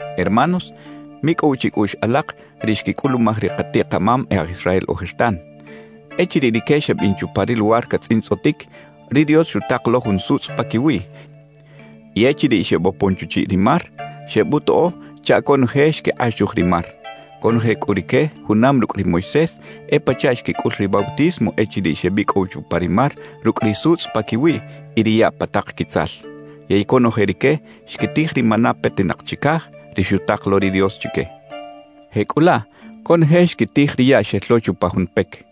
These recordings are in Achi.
Hermanos, micꞌow chicꞌuꞌx alak ri xquicꞌulumaj ri katiꞌ-kamam e aj Israel ojertan. Echiriꞌ rique xebin chupa ri luwar catzꞌintzꞌotic, ri Dios xutak lo jun sutzꞌ paquiwiꞌ y echiriꞌ xebopon chuchiꞌ ri mar, xebutoꞌo chaꞌ conoje xquikꞌaxuj ri mar. Conoje cꞌu rique junam rucꞌ ri Moisés e pachaꞌ xquicꞌul ri bautismo echiriꞌ xebicꞌow chupa ri mar rucꞌ ri sutzꞌ paquiwiꞌ y ri yaꞌ pa tak quitzal. Yey conoje rique xquitij ri maná petinak chicaj, ri xutak lo ri Dios chique. Jecꞌulaꞌ conoje xquitij ri yaꞌ xel lo chupa jun pec.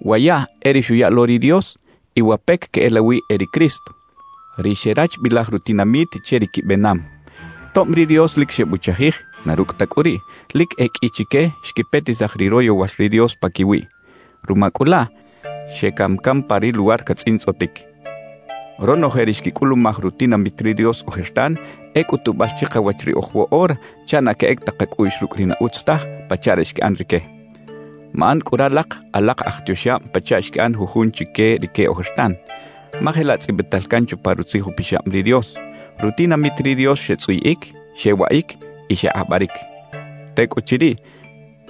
Wa yaꞌ e ri xuya lo ri Dios, y wa pec queꞌelawi e ri Cristo, ri xerachbilaj rutinamit che ri quibenam. Tob ri Dios lic xebuchajij, na rucꞌ ta cꞌu riꞌ, lic e qꞌui chique xquipetisaj ri royowal ri Dios paquiwiꞌ. Ruma cꞌu laꞌ, xecam can pa ri luwar catzꞌintzꞌotic. Ronoje ri xquicꞌulumaj rutinamit ri Dios ojertan e cꞌutubal chikawach riꞌoj woꞌora chaꞌ na queꞌec ta kacꞌuꞌx rucꞌ ri na utz taj pachaꞌ ri xquiꞌan rique. Maꞌan cꞌu ralak alak aj tioxab pachaꞌ xquiꞌan jujun chique rique ojertan. Ma jelaꞌ tzꞌibital can chupa Rutzij Upixab ri Dios: «Rutinamit ri Dios xetzꞌuyiꞌic, xewaꞌic y xekꞌabaric. Tecꞌuchiriꞌ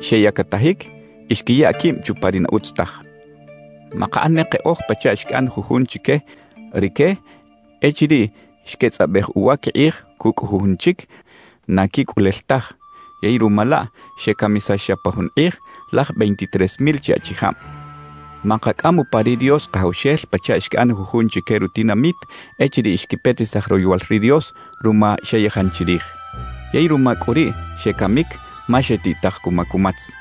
xeyactajic y xquiya quib chupa ri na utz taj.» Makaꞌan ne keꞌoj pachaꞌ xquiꞌan jujun chique rique echiriꞌ xquetzꞌabej uwa quikꞌij cucꞌ jujun chic na quicꞌulel taj, yey ruma laꞌ xecamisax xa pa jun kꞌij laj veintitres mil chi achijab. Makacꞌam upa ri Dios Kajawxel pachaꞌ xquiꞌan jujun chique rutinamit echiriꞌ xquipetisaj royowal ri Dios ruma xeyajan chirij. Yey ruma cꞌu riꞌ xecamic ma xetiꞌtaj cuma cumatz.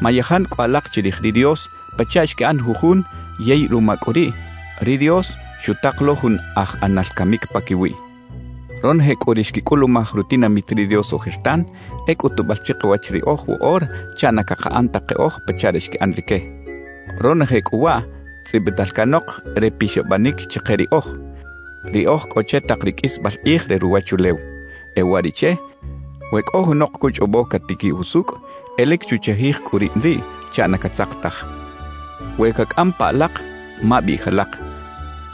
Mayajan cꞌu alak chirij ri Dios pachaꞌ xquiꞌan jujun yey ruma cꞌu riꞌ, ri Dios xutak lo jun aj ꞌAnal Camic paquiwiꞌ. Ronoje cꞌu ri xquicꞌulumaj rutinamit ri Dios ojertan e cꞌutubal chikawach riꞌoj woꞌora chaꞌ na cakaꞌan ta keꞌoj pachaꞌ ri xquiꞌan rique. Ronoje cꞌu waꞌ tzꞌibital canok re pixabanic chike riꞌoj, ri oj cꞌo che tak ri qꞌuisbal kꞌij re ruwachulew. E uwariꞌche, we cꞌo junok cuchꞌobo catiquiꞌ jusucꞌ, e lic chuchajij cꞌu rib riꞌ chaꞌ na catzak taj. We cacꞌam pa alak, mabiꞌij alak: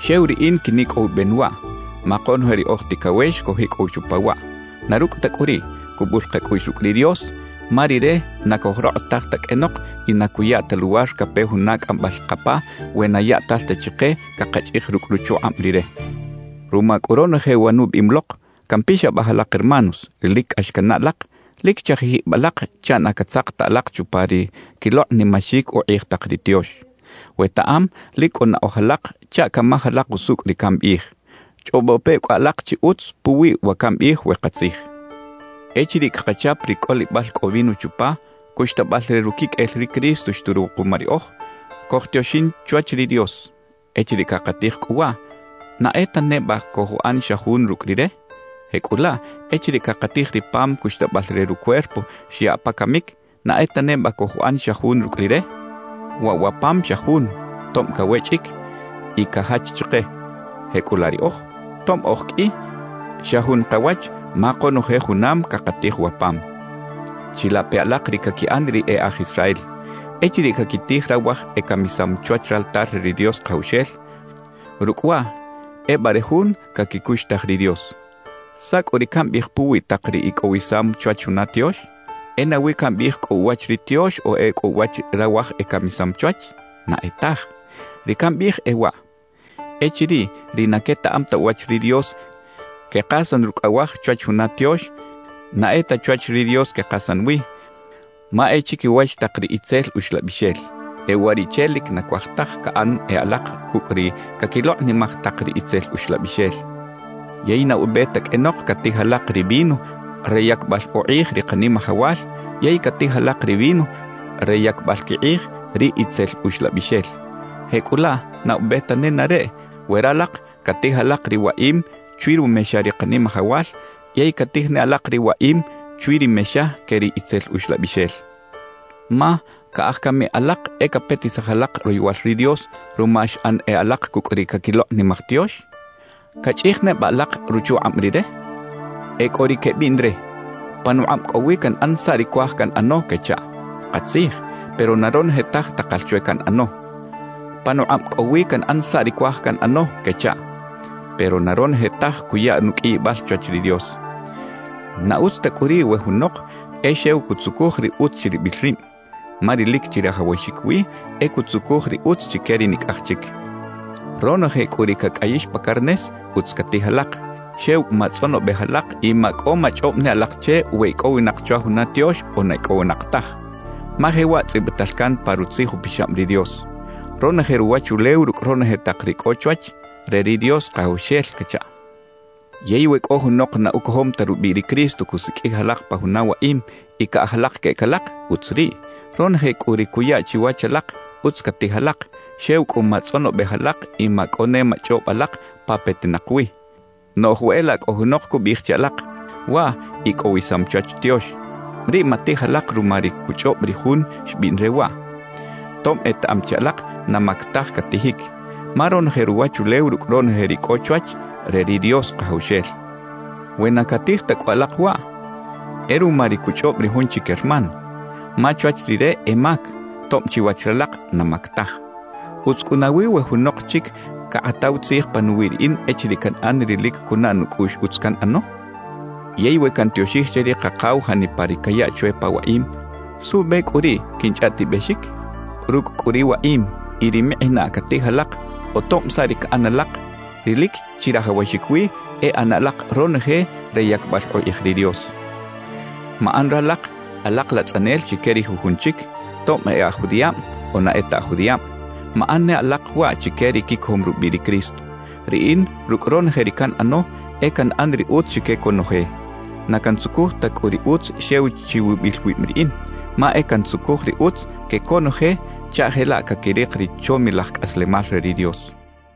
«Xew riꞌin quinicꞌowiben waꞌ», ma konoje ri oj ticawex cojicꞌow chupa waꞌ. Na rucꞌ ta cꞌu riꞌ, cubul kacꞌuꞌx rucꞌ ri Dios, ma Rire na cojrokꞌotaj ta qꞌuenok y na cuya ta luwar cape juna cꞌambal kapa we na yaꞌtal ta chike cakachꞌij rucꞌ ruchukꞌab Rire. Ruma cꞌu ronoje wa nubiꞌim lok, campixabaj alak hermanos, ri lic cꞌax cannaꞌ alak: Lic chajij ib alak chaꞌ na catzak ta alak chupa ri quilokꞌnimaxic ukꞌij tak ri tiox. Wetaꞌam lic cꞌo naꞌoj alak chaꞌ camaj alak usucꞌ ri cambiꞌij. Chꞌobo pe cꞌu alak chi utz puwi wa cambiꞌij we katzij. Echiriꞌ cakachap ri cꞌolibal cꞌo vino chupa, cuxtabal re ruquiqꞌuel ri Cristo xturuw kuma riꞌoj, cojtioxin chwach ri Dios. Echiriꞌ cakatij cꞌu waꞌ, ¿na e ta neba cojuꞌan xa jun rucꞌ Rire? Jecꞌulaꞌ echiriꞌ cakatij ri pam cuxtabal re rucuerpo xyaꞌ pa camic, ¿na e ta neba cojuꞌan xa jun rucꞌ Rire? Waꞌ wa pam xa jun, tob cawechꞌic y cajach chike. Jecꞌulaꞌ riꞌoj, tob oj qꞌui, xa jun kawach ma konoje junam cakatij wa pam. Chilape alak ri caquiꞌan ri e aj Israel. Echiriꞌ caquitij rawaj ecamisam chwach raltar re ri Dios Kajawxel, rucꞌ waꞌ ebare jun caquicuxtaj ri Dios. ¿Saꞌ cꞌu ri cambiꞌij puwi tak ri icꞌowisam chwach juna tiox? ¿E nawi cambiꞌij cꞌo uwach ri tiox o e cꞌo uwach rawaj ecamisam chwach? ¡Na e taj! Ri cambiꞌij e waꞌ: Echiriꞌ ri na quetaꞌam ta uwach ri Dios quekasan rucꞌ awaj chwach juna tiox, na e ta chwach ri Dios quekasan wi, ma e chiquiwach tak ri itzel uxlabixel. E uwariꞌche lic na cuaj taj caꞌan e alak cucꞌ ri caquilokꞌnimaj tak ri itzel uxlabixel. Yey na ube ta qꞌuenok catij alak ri vino re yacbal ukꞌij ri Kanimajawal yey catij alak ri vino re yacbal quikꞌij ri itzel uxlabixel. Jecꞌulaꞌ na ube ta nenareꞌ we ralak catij alak ri waꞌim chwi rumexa ri Kanimajawal yey catij ne alak ri waꞌim chwi ri mexa que ri itzel uxlabixel. Ma ¿caꞌaj cami alak e capetisaj alak royowal ri Dios ruma xꞌan e alak cucꞌ ri caquilokꞌnimaj tiox? ¿Cachꞌij neba alak ruchukꞌab Rire? E cꞌo ri quebiꞌn re: «Panukꞌab cꞌo wi canꞌan saꞌ ri cuaj canꞌano» quechaꞌ. Katzij, pero na ronoje taj takal chwe canꞌano. «Panukꞌab cꞌo wi canꞌan saꞌ ri cuaj canꞌano» quechaꞌ. Pero na ronoje taj cuya nuqꞌuiyibal chwach ri Dios. Na utz ta cꞌu riꞌ we junok e xew cutzucuj ri utz chiribil rib, ma ri lic chirajawaxic wi e cutzucuj ri utz chique ri nicꞌaj chic. Ronoje cꞌu ri cacꞌayix pa carnes, utz catij alak; xew matzꞌonobej alak y macꞌo machꞌob ne alak che we icꞌowinak chwa juna tiox o na icꞌowinak taj. Ma jewaꞌ tzꞌibital can pa Rutzij Upixab ri Dios: Ronoje ruwachulew rucꞌ ronoje tak ri cꞌo chwach, re ri Dios Kajawxel cachaꞌ. Yey we cꞌo junok na ucojom ta rubiꞌ ri Cristo cusiqꞌuij alak pa juna waꞌim y caꞌaj alak queꞌec alak, utz riꞌ. Ronoje cꞌu ri cuya chiwach alak, utz catij alak, xew cꞌu matzꞌonobej alak y macꞌo ne machꞌob alak pa petinak wi. Noꞌj we e laꞌ cꞌo junok cubiꞌij che alak: «Waꞌ icꞌowisam chwach tiox,» riꞌ matij alak ruma ri cuchꞌob ri jun xbiꞌn re waꞌ, tob etaꞌam chi alak na mac taj catijic. Ma ronoje ruwachulew rucꞌ ronoje ri cꞌo chwach, re ri Dios Kajawxel. We na catij ta cꞌu alak waꞌ, e ruma ri cuchꞌob ri jun chic hermano, ma chwach rire e mac, tob chiwach ralak na mac taj. ¿Utz cꞌu nawi we junok chic cakꞌataw tzij panuwiꞌ riꞌin echiriꞌ canꞌan ri lic cunaꞌ nucꞌuꞌx utz canꞌano? Yey we cantioxij che ri Kakaw janipa ri cayaꞌ chwe pa waꞌim, ¿suꞌbe cꞌu riꞌ quinchꞌaꞌtibexic? Rucꞌ cꞌu ri waꞌim y ri mikꞌinaꞌ catij alak o tob saꞌ ri caꞌan alak, ri lic chirajawaxic wi e ꞌana alak ronoje re yacbal ukꞌij ri Dios. Maꞌan ralak alak latzꞌanel chique ri jujun chic, tob e aj judiꞌab o na e ta aj judiꞌab; maꞌan ne alak waꞌ chique ri quicojom rubiꞌ ri Cristo. Riꞌin rucꞌ ronoje ri canꞌano, e canꞌan ri utz chique conoje. Na cantzucuj ta cꞌu ri utz xew chiwibil wib riꞌin, ma e cantzucuj ri utz que conoje chaꞌ jelaꞌ caquirik ri chomilaj cꞌaslemal re ri Dios.